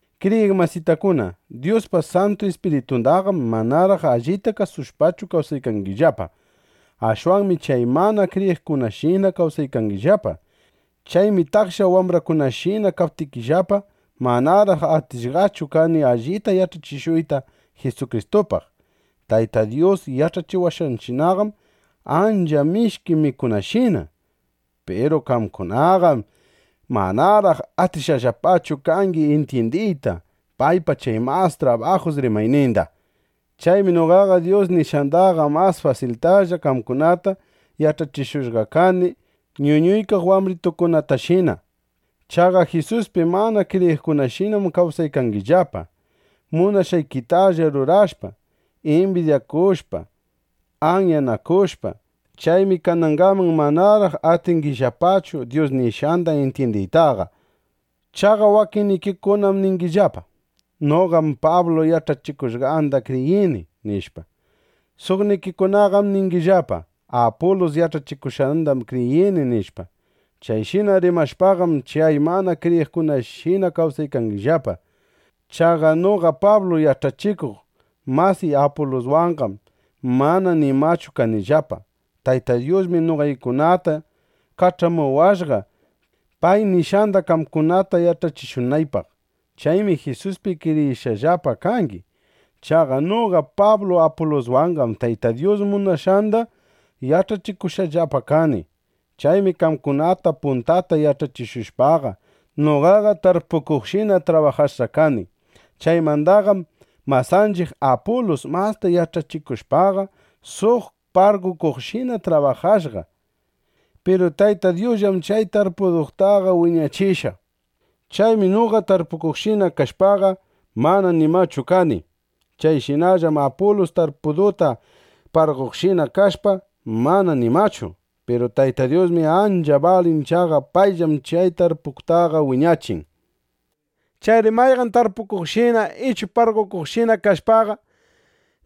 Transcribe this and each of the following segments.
Kriyiq masitakuna, Dyuspa Santu Ispiritundaqam manaraq allita kasushpachu kawsaykangillapa. Ashwanmi chay mana kriyiqkunashina kawsaykangillapa. Chaymi taksha wambrakunashina kaptikillapa, manaraq atishqachu kani allita yach'achishuyta Jisukristupaq. Tayta Dyus yach'achiwashqanchiqqam ancha mishki mikunashina. Piru qamkunaqam manaraq atishqallapachu kangi intyindiyta paypa chay mas trabajus rimayninda. Chaymi noqaqa Dyus nishqandaqa mas fasiltalla qamkunataqa yach'achishushqa kani ñuñuykaq wambritukunatashina. Chaqa Jisuspi mana kriyiqkunashinam kawsaykangillapa, munashqaykitalla rurashpa, imbidyanakushpa, anyanakushpa. (Chaymi kanangaman manaraq atingillapachu Dyus nishqanda intyindiytaqa.) Chaqa wakinnikikunam niykangillapa: “Noqaqam Pablu yach'achikushqanda kriyini”, nishpa. Suqnikikunaqam ningillapa: “Apulus yach'achikushqandam kriyini”, nishpa. Chayshina rimashpaqam, chay mana kriyiqkunashinalla kawsaykangillapa. Chaqa noqa Pablu yach'achikuq masiy Apuluswanqam mana nimachu kanillapa. Tayta Dyusmi noqaykunata kach'amuwashqa, pay nishqanda qamkunata yach'achishunaypaq. Chaymi Jisuspi kriyishqallapa kangi. Chaqa noqa Pablu Apuluswanqam Tayta Dyus munashqanda yach'achikushqallapa kani. Chaymi qamkunata puntata yach'achishushpaqa, noqaqa tarpukuqshina trabajashqa kani. Chaymandaqam masanchiq Apulus, masta yach'achishushpaqa, suq parqokuqshina trabajashqa. Piru Tayta Dyusllam chay tarpudutaqa wiñachishqa. Chaymi noqa tarpukuqshina kashpaqa, mana nimachu kani. Chayshinallam Apulus tarpuduta parqoqshina kashpa, mana nimachu. Piru Tayta Dyusmi ancha balin. Chaqa payllam chay tarpudutaqa wiñachin. Chayri mayqan tarpukuqshina ichu parqokuqshina kashpaqa,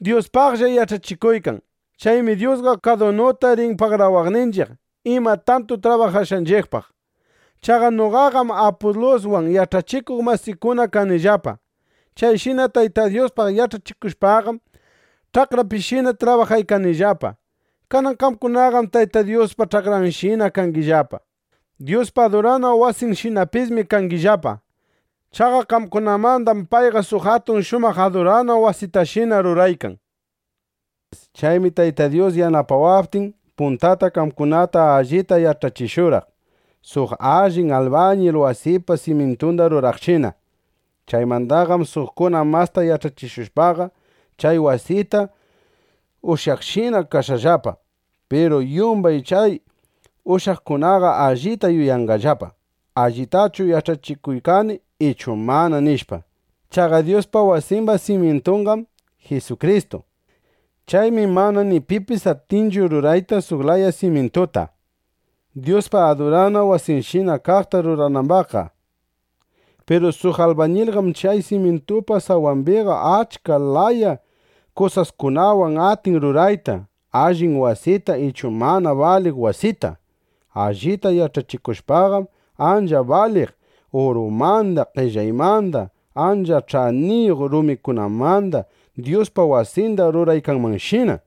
Dyuspaqlla yach'achikuykan. Chaymi Dyusqa kadunuta rin pagarawaqninchiq ima tantu trabajashqanchiqpaq. Chaqa noqaqam Apuluswan yach'achikuq masikuna kanillapa. Chayshina Tayta Dyuspaq yach'achikushpaqam, ch'akrapishina trabajaykanillapa. Kanan qamkunaqam Tayta Dyuspa ch'akranshina kangillapa. Dyuspa adurana wasinshinapismi kangillapa. Chaqa qamkunamandam payqa suq atun shumaq adurana wasitashina ruraykan. Chaymi Tayta Dyus yanapawaptin, puntata qamkunata allita yach'achishurqaq, suq allin albañil wasipa simyintunda ruraqshina. Chaymandaqam suqkuna masta yach'achishushpaqa, chay wasita ushyaqshina kashqallapa. Piru yumbay chay ushyaqkunaqa allita yuyanqallapa: ¿Allitachu yach'achikuykani ichu mana? nishpa. Chaqa Dyuspa wasimba simyintunqam Jisukristu. Chaymi mana ni pipis atinchu rurayta suq laya simyintuta, Dyuspa adurana wasinshina kaqta ruranambaqqa. Piru suq albañilqam chay simyintupa sawambiqa achka laya kusaskunawan atin rurayta allin wasita ichu mana baliq wasita. Allita yach'achikushpaqam, ancha baliq urumanda, qellaymanda, ancha ch'aniyuq rumikunamanda Dyuspa wasinda ruraykanmanshina.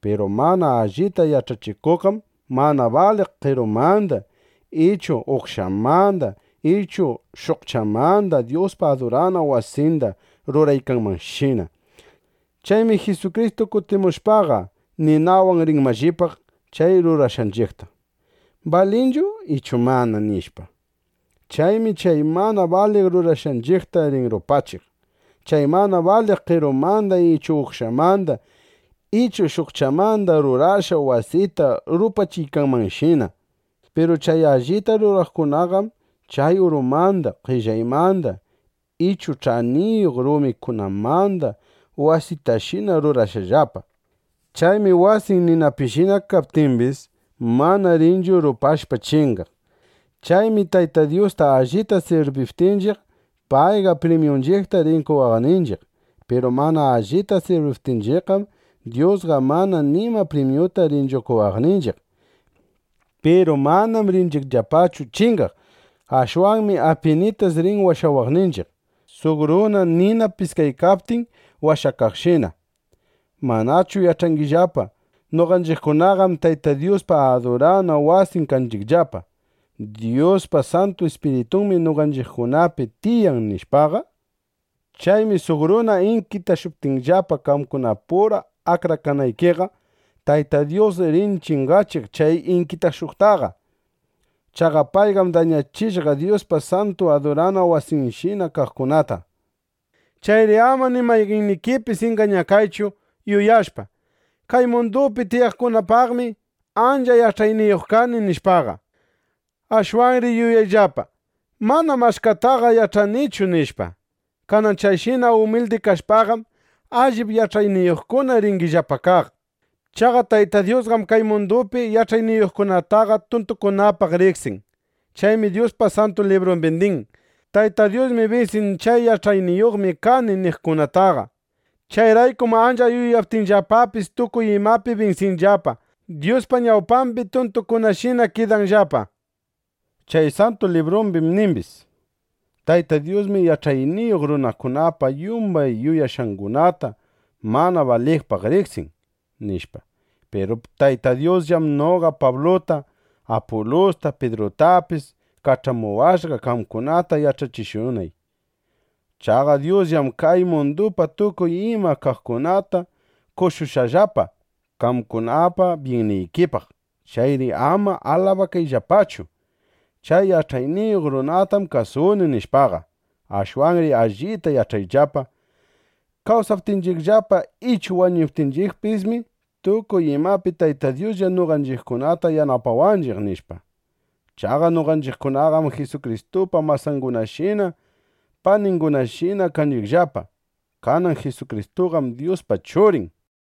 Piru mana allita yach'achikuqqam mana baliq qerumanda ichu uqshamanda ichu shukchamanda Dyuspa adurana wasinda ruraykanmanshina. Chaymi Jisukristu kutimushpaqa, ninawan rin mallipaq chay rurashqanchiqta: ¿Balinchu ichu mana? nishpa. Chaymi chay mana baliq rurashqanchiqta rin rupachiq, chay mana baliq qerumanda ichu uqshamanda ichu shukchamanda rurashqa wasita rupachiykanmanshina. Piru chay allita ruraqkunaqam chay urumanda, qellaymanda ichu ch'aniyuq rumikunamanda wasitashina rurashqallapa. Chaymi wasin ninapishina kaptimbis, mana rinchu rupashpa chingaq. Chaymi Tayta Dyusta allita sirbiptinchiq, payqa primyunchiqta rin qowaqninchiq. Piru mana allita sirbiptinchiqqam, Dyusqa mana nima primyuta rinchu qowaqninchiq. Piru manam rinchiqllapachu chingaq. Ashwanmi apinitas rin washawaqninchiq, suq runa nina piskaykaptin washakaqshina. ¿Manachu yach'angillapa: Noqanchiqkunaqam Tayta Dyuspa adurana wasin kanchiqllapa; Dyuspa Santu Ispiritunmi noqanchiqkunapi tiyan, nishpaqa? Chaymi suq runa inkitashuptinllapa, qamkunapura akrakanaykiqa, Tayta Dyus rin chingachiq chay inkitashuqtaqa. Chaqa payqam dañachishqa Dyuspa santu adurana wasinshina kaqkunata. Chayri ama ni mayqannikipis ingañakaychu, yuyashpa: Kay mundupi tiyaqkunapaqmi ancha yach'ayniyuq kani, nishpaqa. Ashwanri yuyayllapa: Manam achkataqa yach'anichu, nishpa. Kanan chayshina umildi kashpaqam, allip yach'ayniyuqkuna ringillapa kaq. Chaqa Tayta Dyusqam kay mundupi yach'ayniyuqkunataqa tuntukunapaq riqsin. Chaymi Dyuspa Santu Librumbi nin: “Tayta Dyusmi binsin chay ‘Yach'ayniyuqmi kani’ niqkunataqa. Chayraykum ancha yuyaptinllapapis tukuy imapi binsinanllapa, Dyuspa ñawpambi tuntukunashina kidanllapa”, nishpa. Chay Santu Librumbim nimbis: “Tayta Dyusmi yach'ayniyuq runakunapa yumbay yuyashqangunata mana baliqpaq riqsin”, nishpa. Piru Tayta Dyusllam noqa Pabluta, Apulusta, Pidrutapis kach'amuwashqa, qamkunata yach'achishunay. Chaqa Dyusllam kay mundupa tukuy iman kaqkunata qoshushqallapa qamkunapa byinnikipaq. Chayri ama alabakayllapachu: “Chay yach'ayniyuq runatam kasuni”, nishpaqa. Ashwanri allita yach'ayllapa: Kawsaptinchiqllapa ichu wañuptinchiqpismi, tukuy imapi Tayta Dyuslla noqanchiqkunata yanapawanchiq, nishpa. Chaqa noqanchiqkunaqam Jisukristupa masangunashina, paningunashina kanchiqllapa. Kanan Jisukristuqam Dyuspa Churin.